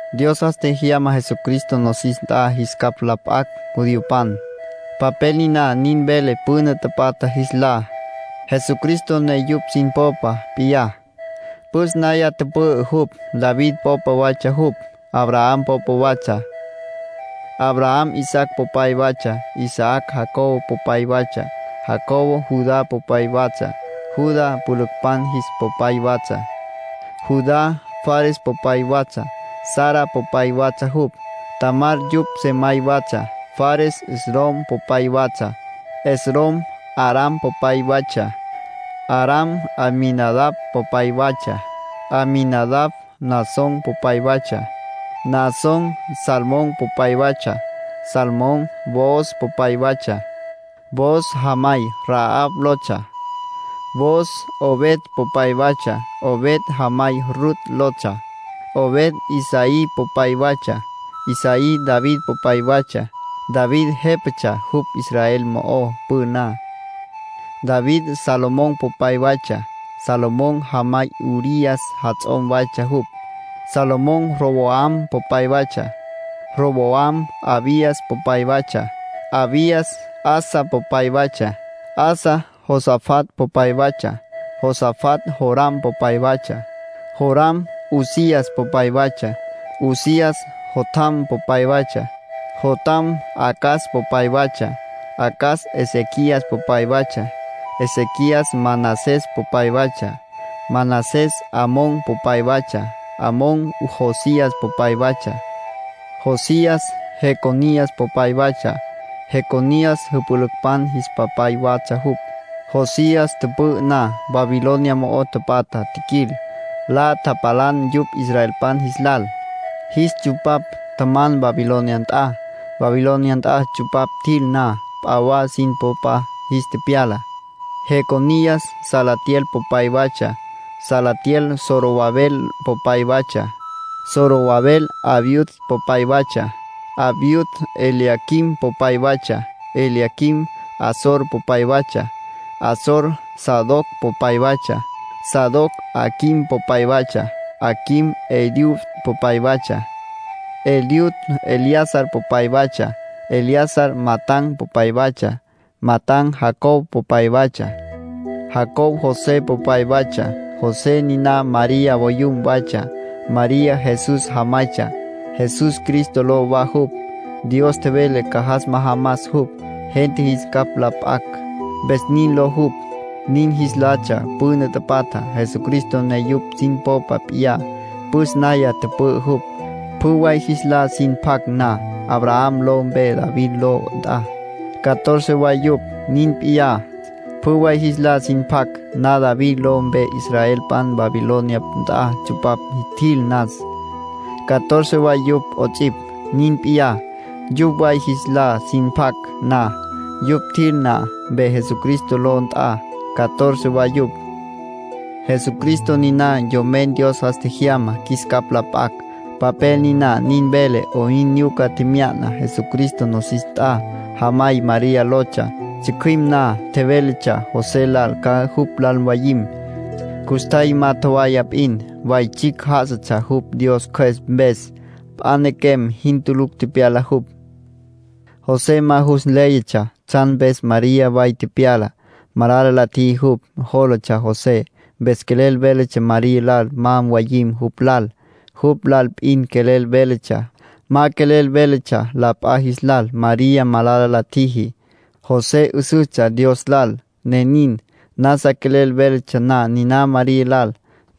Dios jas tjejyama Jesucristo nosis nt'a jis capj la p'acj judiopan. Papel niná nin vele püna tapatja jis lá, Jesucristo ne yupj sin popa p'iyá, püs naya tüpü'ü jupj. David popa watsja jupj. Abraham popa watsja. Abraham Isaac popay waytsja. Isaac Jacob popay waytsja. Jacob Judá popay waytsja, Judá jüpülücpan jis popay watsja. Judá Fares popay waytsja, Zara popay watsja jupj. Tamar yupj sejamay waytsja. Fares Esrom popay waytsja. Esrom Aram popay waytsja. Aram Aminadab popay waytsja. Aminadab Naasón popay waytsja. Naasón Salmón popay waytsja. Salmón Booz popay waytsja. Booz jamay Rahab lotsja. Booz Obed popay waytsja. Obed jamay Rut lotsja. Obed Isaí popay waytsja. Isaí David popay waytsja. David jépatsja jupj Israel mo'ó püná. David Salomón popay waytsja. Salomón jamay Urías jats'om waytsja jupj. Salomón Roboam popay waytsja. Roboam Abías popay waytsja. Abías Asa popay waytsja. Asa Josafat popay waytsja. Josafat Joram popay waytsja. Joram Uzías popay waytsja. Uzías Jotam popay waytsja. Jotam Acaz popay waytsja. Acaz Ezequías popay waytsja. Ezequías Manasés popay waytsja. Manasés Amón popay waytsja. Amón Josías popay waytsja. Josías Jeconías popay waytsja, Jeconías jüpülücpan jis papay watsja jupj. Josías tüpü'ü na, Babilonia mo'o tapatja tjiquil, la tapalan yupj israelpan jis lal. Jis tsupapj, tjaman Babilonia nt'a. Babilonia nt'a tsupapj tjil na, p'a wa sin popa jis tepyala. Jeconías Salatiel popay waytsja. Salatiel Zorobabel popay waytsja. Zorobabel Abiud popay waytsja. Abiud Eliaquim popay waytsja. Eliaquim Azor popay waytsja. Azor Sadoc popay waytsja. Sadoc Aquim popay waytsja. Aquim Eliud popay waytsja. Eliud Eleazar popay waytsja. Eleazar Matán popay waytsja. Matán Jacob popay waytsja. Jacob José popay waytsja. José niná María voyum waytsja. María Jesús jamaytsja. Jesús, Cristo ló wa jupj; Dios tjevele ca jas majamas jupj, gente jis capj la p'acj, mpes nin ló jupj. Nin jis latsja püna tapatja, Jesucristo ne yupj sin popa p'iyá, püs naya tüpü'ü jupj. Pjü way jis lá sin pac na Abraham ló mpe David ló nt'a, catorce way yupj. Nin p'iyá, pjü way jis lá sin pac na David ló mpe israelpan Babilonia nt'a tsupapj tjil nas, catorce way yupj 'ots'ipj. Nin p'iyá, pjü way jis lá sin pac na yupj tjil na mpe Jesucristo ló nt'a, catorce wa yupj. Jesucristo niná Yomen Dios jas tjejyamá qjuis capj la p'acj. Papel niná nin vele 'oyn nyuca tjemya'na Jesucristo nosis nt'a. Jamay María lotsja. Tsjücjüim na tjevéletsja José lal ca jupj lal mwayim. Custjay ma tjowaya p'in, way tsjicj já'asatsja jupj Dios Cjües mpes. P'a nequem jin tulucj tepyala jupj. José ma jus nléyatsja tsjan mpes María way tepyala. Malala la tjiji jupj, jólatsja José. Mpes quelel véletsja María lal ma mwayim jupj lal. Jupj lal p'in quelel véletsja. Ma quelel véletsja la p'a jis lal María malala la tjiji. José 'üsüstsja Dios lal, ne nin. Nasa quelel véletsja na niná María lal,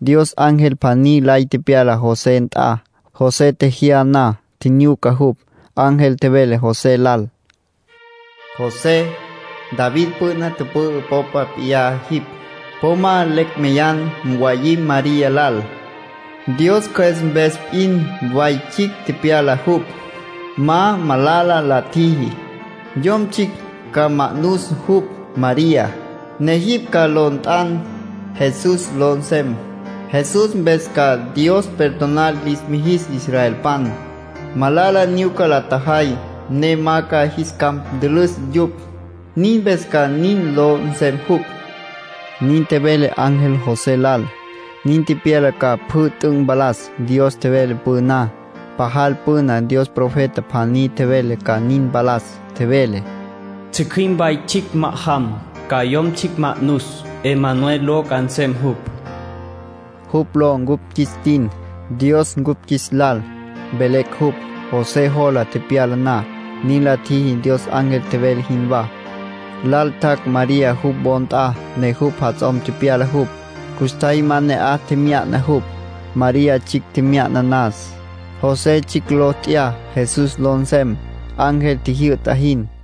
Dios ángel pjaní lay tepyala José nt'a. José tjejyá na tjinyuca jupj. Ángel tjevele José lal: “José, David püna tüpü'ü popa p'iyá jipj. Po ma lecj meyan mwayim María lal. Dios Cjües mpes p'in way tsjicj tepyala jupj. Ma malala la tjiji. Yom tsjicj ca ma'nus jupj, María, ne jipj ca ló nt'an, Jesús ló nsem. Jesús mpes ca Dios perdonar lis mijis israelpan, malala nyuca la tjajay, ne ma ca jis capj ntülüs yupj. Nin mpes ca nin ló nsem jupj”, nin tjevele ángel José lal. Nin tepyala ca pjü t'üc' mpalas Dios tjevele püná. Pajal püna Dios profeta pjaní tjevele ca nin mpalas. Tjevele: “Tsjücjüim way tsjicj ma'ajam, ca yom tsjicj ma'nus. ‘Emanuel’ ló ca nsem jupj.” Jupj ló cupj qjuis tin “Dios Cupj Qjuis Lal” velecj cupj. José jola tepyala na, nin la tjiji Dios ángel tjevele jinwá. Lal tjac' María jupj wo nt'a ne jupj jats'om tepyala jupj. Custjay ma ne'aj tjemya'na jupj, María tsjicj tjemya'na nas. José tsjicj ló t'ya Jesús ló nsem, ángel tjijyü'ta jin.